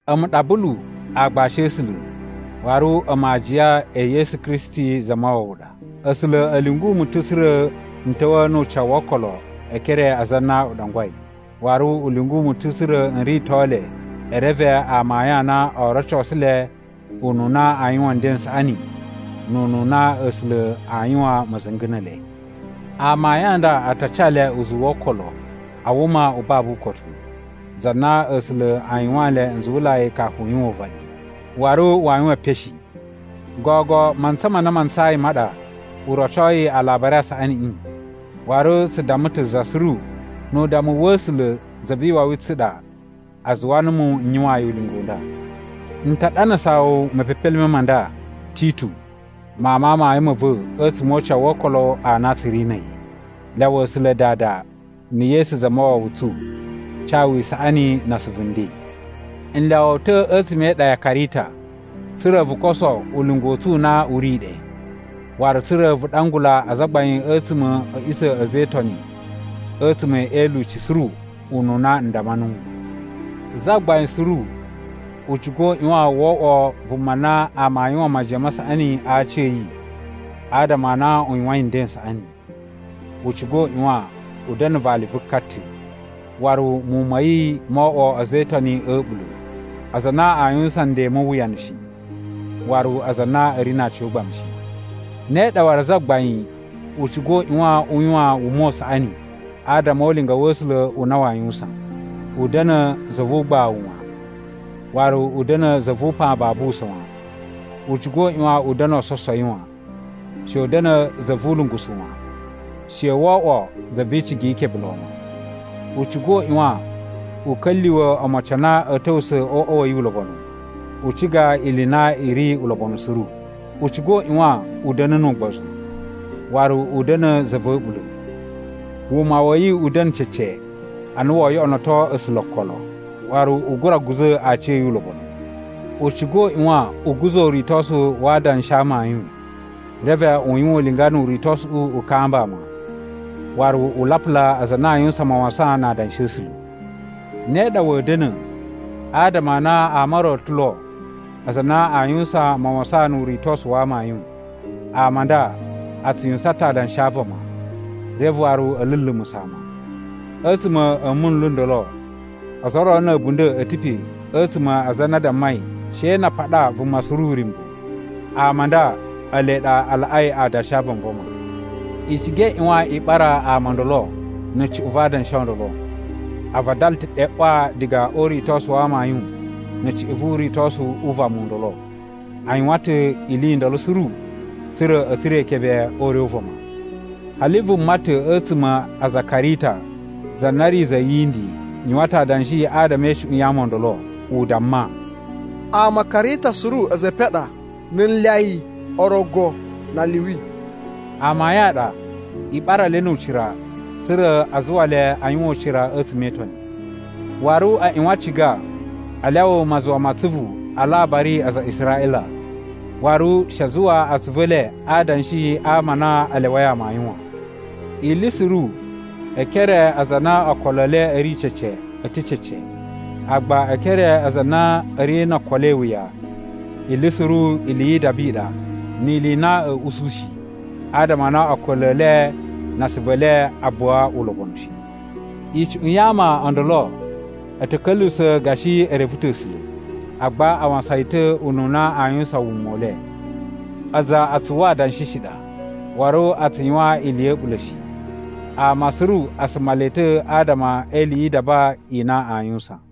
A̱mu ɗa Bulu aagbashi a̱ A̱sula̱, waru a̱mu aajiya e Yesu Kristi Zamawawa ɗa. A̱sula̱ a̱ lyungu mu ta̱ tsa̱ra̱ n ta̱wa̱a̱ nu ucawu wo okolo e ekere a aza a na u ɗangwai. Waru u lyungu mu ta̱ tsa̱ra̱ n rito le e reve amayun a na oo rocosu le ununa aa yuwan nden n saꞌani nu ununa A̱sula̱ aa yuwan ma̱za̱nga̱ ne ele. Amayun a nda a ta ca le uzuwu wo okolo a wuma u babu ukotu, za na A̱sula̱ a yuwaan nle nzuwulai kafu u yuwan uvaɗi, waru waa yuwan epen shi. Gogo mantsa ma na ma ntsayi ma ɗa, u rocoi Alabari a Saꞌaniꞌi, waru tsu damma ta̱ za suru. Nu udammu wa̱ A̱sula̱ Za vi Iwawi i tsu i ɗa a zuwa numu n yuwaan yi ulinga u nda. N ta ɗanasaa wu mepepelime ma nda, Titu, mawun ma amayun ma̱ va̱ a̱tsuma̱ o ucawu wo okolo a na tsu ri na̱ a̱yi. Lyawa A̱sula̱ Dada na̱ Yesu Zamawawa tsu ca wu isaꞌani na asuvu nden. N lyawa wu ta̱ a̱tsuma̱ e iɗa ya Karita, tsa̱ra̱ vu koso ulinga u tsu u na u ri ɗe, waru tsa̱ra̱ vu ɗangula azagbain a̱tsuma̱ a̱ a̱ꞌisa̱ a̱ a̱za̱ e Itoni a̱tsuma̱ e ilyuci suru ununa n damma nuwu. Zagbain suru u ciga u ꞌyuwan wo oꞌwo vuma na ama a yuwan majiyan ma saꞌani a aci a̱ yi adama a na u yuwain nden n saꞌani. U ciga u ꞌyuwan u da̱na̱ vali vu ka ta̱. Waru muwun ma̱ yi moo oꞌwo a̱za̱ e Itoni a̱ a̱ɓula̱, aza a na aa yuwusan nden mu uwuyanu shi, waru aza a na a̱ ri na aciyogbamu shi. Ne ɗa waru zagbain u ciga u ꞌyuwan u yuwan wuma u saꞌani adama o ulinga wa̱ A̱sula̱ u na waa yuwusan. U da̱na̱ za vu ugbawu wan, waru u da̱na̱ za vu upan babu usa̱n wan. U ciga u ꞌyuwan u da̱na̱ ososowi wan. She u da̱na̱ za vu ulungusu wan. She wo oꞌwo za vi icigi yi ikebe lon wan. U ciga u ꞌyuwan u ka̱lyuwa̱ omocin a na a̱a̱ ta̱wusa̱ o uꞌwa wa̱ yi ulobonu, u ciga ili i na i ri ulobonu suru. U ciga u ꞌyuwan u da̱na̱ nu ugbozu, waru u da̱na̱ za va̱ a̱ɓula̱. Wuma wa̱ yi u da̱na̱ cece a na woo yoꞌonoto A̱sula̱ okolo, waru u gura guza̱ aciya̱yi ulobonu. U ciga u ꞌyuwan u guza̱ uritosu wa adanshi a amayun. Reve u yuwan ulinga nu uritosuꞌu u kamba ama, waru u lapula aza a na a yuwusan mawasan na adanshi a̱ A̱sula̱. Ne ɗa wa̱a̱ da̱na̱ adama a na ama o ro o ta̱ lo aza a na a yuwusan mawasan nu uritosu wa amayun. Ama a nda a tsu yuwusan ta̱ adanshi a vama, reve waru a̱ lulumusa̱ ama. A̱tsuma̱ a̱ munlu n ndolo ozo o ro na̱ a̱bunda̱ a̱ ta̱ pe a̱tsuma̱ a aza a na a dammai she na a paɗa vuma suru uryumbu. Ama a nda ele ɗa a laꞌai adanshi a vanvama. I ciga i ꞌyuwan i ɓara ama o ndolo na̱ cuꞌun va adanshi o ndolo. A vadala ta̱ ɗe ꞌwa diga o uritosu wa amayun na̱ cuꞌun vu uritosu u vama u ndolo. A yuwan ta̱ ili i ndolo suru tsa̱ra̱ a̱ tsura̱ ikebe o ure u vama. Hali vuma ta̱ a̱tsuma̱ a aza a Karita za na ri za yindi yuwan ta̱ adanshi adama e icuꞌun ya ama o ndolo, u damma, “Ama a Karita suru a̱za̱ e epen a ɗa, na̱ nlyayi, orogo, na aliwi.” Amayun a ɗa. I ɓara le nu ucira tsa̱ra̱ a zuwa le a yuwan ucira a̱tsuma̱ e Itoni. Waru a ꞌyuwan a ciga a lyawa mazuwa ma atsuvu a alabari a aza a Israꞌila, waru she a zuwa atsuvu e le a adanshi a ama a na a lyawai amayun wan. Ili suru e ekere a aza a na okolo e le a̱ ri cece a̱ ta̱ cece. Agba e ekere a aza a na a̱ ri no okolo e iwuya, ili suru ili yi idaba i ɗa ni ili i na a̱a̱ usu shi, adama a na okolo e le na asuvu e le a buwa ulobonu shi. Icuꞌun ya ama o ndolo a̱ ta̱ ka̱lyuwusa̱ gashi e reve ta̱ A̱sula̱, agba a wasan yi ta̱ ununa aa yuwusan wuma u le. Aza a tsu uwwa adanshi shi ɗa, waru a tsu yuwan ili ya̱ a̱ɓula̱ shi. Ama suru a suma le ta̱ adama e ili yi idaba i na aa yuwusan.